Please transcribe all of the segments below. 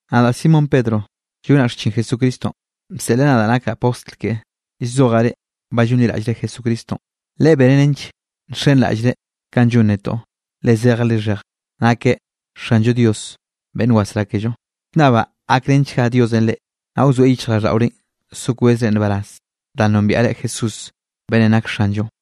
Nadaꞌ Simón Pedro llonaꞌ xchin Jesucristonꞌ, bseꞌleꞌ nadaꞌ nakaꞌ postl keꞌe. Llzojaꞌ reꞌ ba llonliraꞌllre Jesucristonꞌ. Leꞌe beneꞌ nench nxenraꞌllreꞌ kanꞌ llon netoꞌ, le zejeꞌ lixheje nakeꞌ Xanllo Dios beꞌnn wasrá kello. Llnnabaꞌ gakrenchga Diosenꞌ reꞌ, naꞌ wzoeꞌ yichjraꞌlldaꞌorenꞌ so kwezre nbaraz danꞌ nombiaꞌre Jesús beꞌnnenꞌ nak Xanllonꞌ.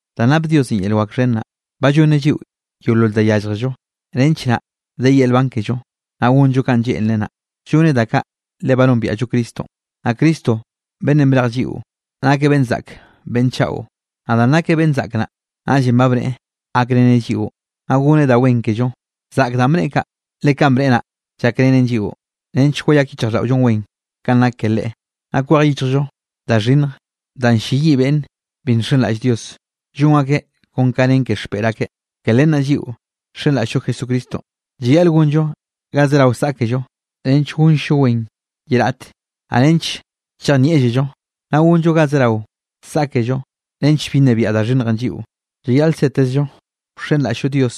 Danꞌ nap Diosenꞌ yel wak xhen naꞌ, ba llonneꞌ lliꞌo yeolol da yálljello, nench naꞌ de yel nban kello, naꞌ gonllo kanꞌ lleꞌnreꞌ naꞌ. Llonneꞌ da kaꞌ le ba nombiaꞌllo Cristonꞌ, naꞌ Cristo beꞌnnenꞌ brej lliꞌo, nakeꞌ beꞌnn zaꞌk beꞌnn chaꞌo. Naꞌ danꞌ nakeꞌ beꞌnn zaꞌk naꞌ, naꞌllenꞌ ba bneꞌe gakreneꞌ lliꞌo, naꞌ goneꞌ da wen kello. Zaꞌk danꞌ bneꞌe kaꞌ, le kanꞌ bneꞌe naꞌ llakrenen lliꞌo, nench yeyak yichjraꞌlldaꞌollonꞌ wen kanꞌ nak ke Leꞌe, naꞌ gak kwej yichjllo da xhinnj danꞌ ll-lleyiꞌ beꞌnn bi nxenraꞌll Dios, llon akeꞌ kon ka nen ke xpeꞌr akeꞌ. Ke len naꞌ lliꞌo nxenraꞌll-llo Jesucristonꞌ, llayaꞌl gonllo ga zerao saꞌkello nench gonll-llo wen ye raꞌte, naꞌ nench chejnieꞌllello. Naꞌ gonllo ga zerao saꞌkello nench bi nnebiaꞌ da xhinnjenꞌ lliꞌo. Llayaꞌl setezllo wxenraꞌll-llo Dios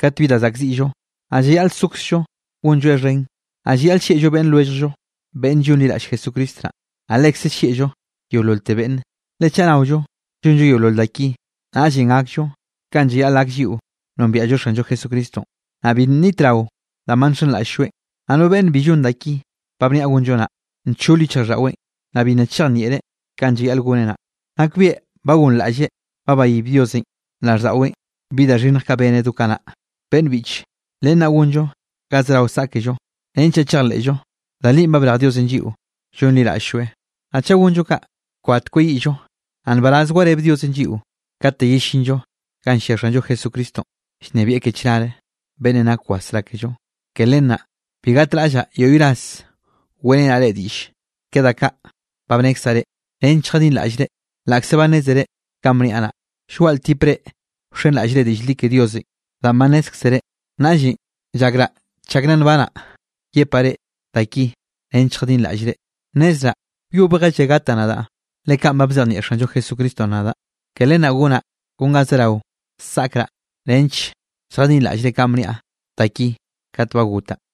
kat bi da zaꞌkziꞌllo, naꞌ llayaꞌl sokzllo gonlloeꞌ xhen. Naꞌ llayaꞌl llieꞌllo beꞌnn lwelljllo beꞌnnenꞌ llonliraꞌll Jesucristo naꞌ, naꞌ lekze llieꞌllo yeololte beꞌnne. Le chaꞌ naollo llonllo yeolol da ki, naꞌllenꞌ gakllo kanꞌ llayaꞌl gak lliꞌo nombiaꞌllo Xanllo Jesucristonꞌ, naꞌ bi nnitrao danꞌ ba nxenraꞌll-lloeꞌn. Naꞌ no beꞌnne bi llon da ki ba bniaꞌ gonllo naꞌ, nchol yichjraꞌlldaꞌweꞌn, naꞌ bi nna chejnieꞌreꞌ kanꞌ llayaꞌl goneꞌ naꞌ. Nakbieꞌ ba gonraꞌlleꞌ ba bayib Diosenꞌ raꞌlldaꞌweꞌn bi da xhinnj kaꞌ beneꞌ do kanaꞌ. Beꞌnn biꞌche, len naꞌ gonllo ga zerao saꞌkello, nench naꞌ chejleꞌllo da li ba brej Diosenꞌ lliꞌo llonliraꞌll-lloeꞌ. Naꞌ chaꞌ gonllo kaꞌ, kbat kweyiꞌllo. Naꞌ nbaraz wareb Diosenꞌ lliꞌo kate yellinllo ganꞌ llia Xanllo Jesucristonꞌ llnebieꞌ ke chnare, beꞌnnenꞌ nak wasrá kello. Ke len naꞌ bi gatraꞌllaꞌ yoꞌy ras weꞌrenaꞌ reꞌ diꞌlle ke da kaꞌ ba bnekzaꞌ reꞌ, nench lljadinraꞌllre, laꞌkze ba nnézere kanꞌ bniaꞌ naꞌ, llgoaꞌ ltip reꞌ wxenraꞌllre diꞌll li ke Diosenꞌ danꞌ ba nnézkzere. Naꞌllenꞌ llakraꞌ chak nna nbanaꞌ, yepaꞌ reꞌ da ki nench lljadinraꞌllre. Nnezraꞌ wyobjelle gataꞌ nadaꞌ, le kaꞌn ba bzejnieꞌ Xanllo Jesucristonꞌ nadaꞌ. Ke len naꞌ gonaꞌ kon ga zerao saꞌkraꞌ nench lljadinraꞌllre kanꞌ bniaꞌ da ki kat ba gotaꞌ.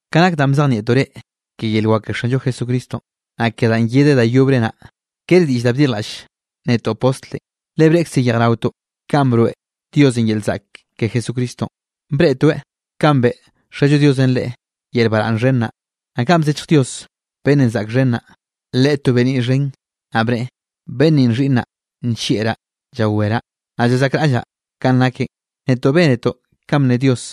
Ka nak danꞌ bzejnieꞌtoꞌ reꞌ ke yel wak ke Xanllo Jesucristonꞌ, naꞌ ke danꞌ yedeꞌ da yobre naꞌ, kere diꞌll da bdirjlaꞌll netoꞌ postlenꞌ, le breꞌkze yejraotoꞌ kanꞌ broeꞌ Diosenꞌ yel zaꞌk ke Jesucristonꞌ. Breꞌtoeꞌ kanꞌ beꞌe Xallo Diosenꞌ Leꞌe yel baraꞌnn xhen naꞌ, naꞌ kanꞌ bzechj Dios beꞌnnenꞌ zaꞌk xen naꞌ Leꞌe to beniꞌ xhen, naꞌ bneꞌe: “Beꞌnn ninꞌ xhiꞌnnaꞌ nllieꞌraꞌ llawereꞌ, naꞌ llazaꞌkraꞌllaꞌ kanꞌ nakeꞌn.” Netoꞌ bénetoꞌ kanꞌ bne Dios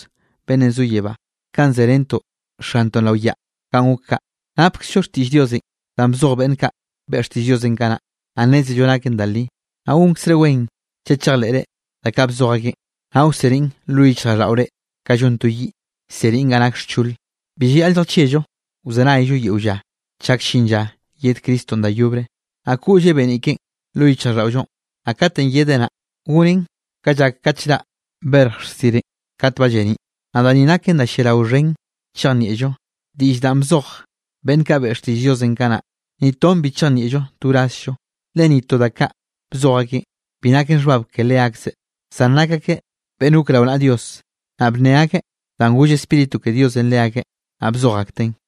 beꞌnnenꞌ zo yebánꞌ, kanꞌ zerentoꞌ Xantoꞌn rao yaꞌ ganꞌ gok kaꞌ. Napkzllo xtiꞌll Diosenꞌ danꞌ bzoj beꞌnn kaꞌ beꞌe xtiꞌll Diosenꞌ kanaꞌ, naꞌ nnézello naken da li. Naꞌ gonkzre wen chaꞌ chejleꞌre da kaꞌ bzoj akeꞌn, naꞌ wseniꞌn lo yichjraꞌlldaꞌore ka llon to yiꞌ, llseniꞌn ga nak xchole. Bi llayaꞌl lljachieꞌllo, wzenayllo yeo lla chak llin lla yed Cristonꞌ da yobre, naꞌ koꞌlleꞌ beniꞌ keꞌen lo yichjraꞌlldaꞌollonꞌ. Naꞌ katenꞌ yedeꞌ naꞌ, gonen ka llak kat llraꞌ berj xsirenꞌ kat ba lleniꞌ. Naꞌ da ni naken da lliarao xhen chejnieꞌllo: diꞌll danꞌ bzoj beꞌnn kaꞌ beꞌe xtiꞌll Diosenꞌ kanaꞌ, ni ton bi chejnieꞌllon to wrazllo. Le ni to da kaꞌ bzoj akeꞌn, bi naken xhbab ke leakzeꞌ. Zan nak akeꞌ beꞌnn gok rao naꞌa Dios, naꞌ bne akeꞌ danꞌ goll Spíritu ke Diosenꞌ leakeꞌ, naꞌ bzoj akteꞌn.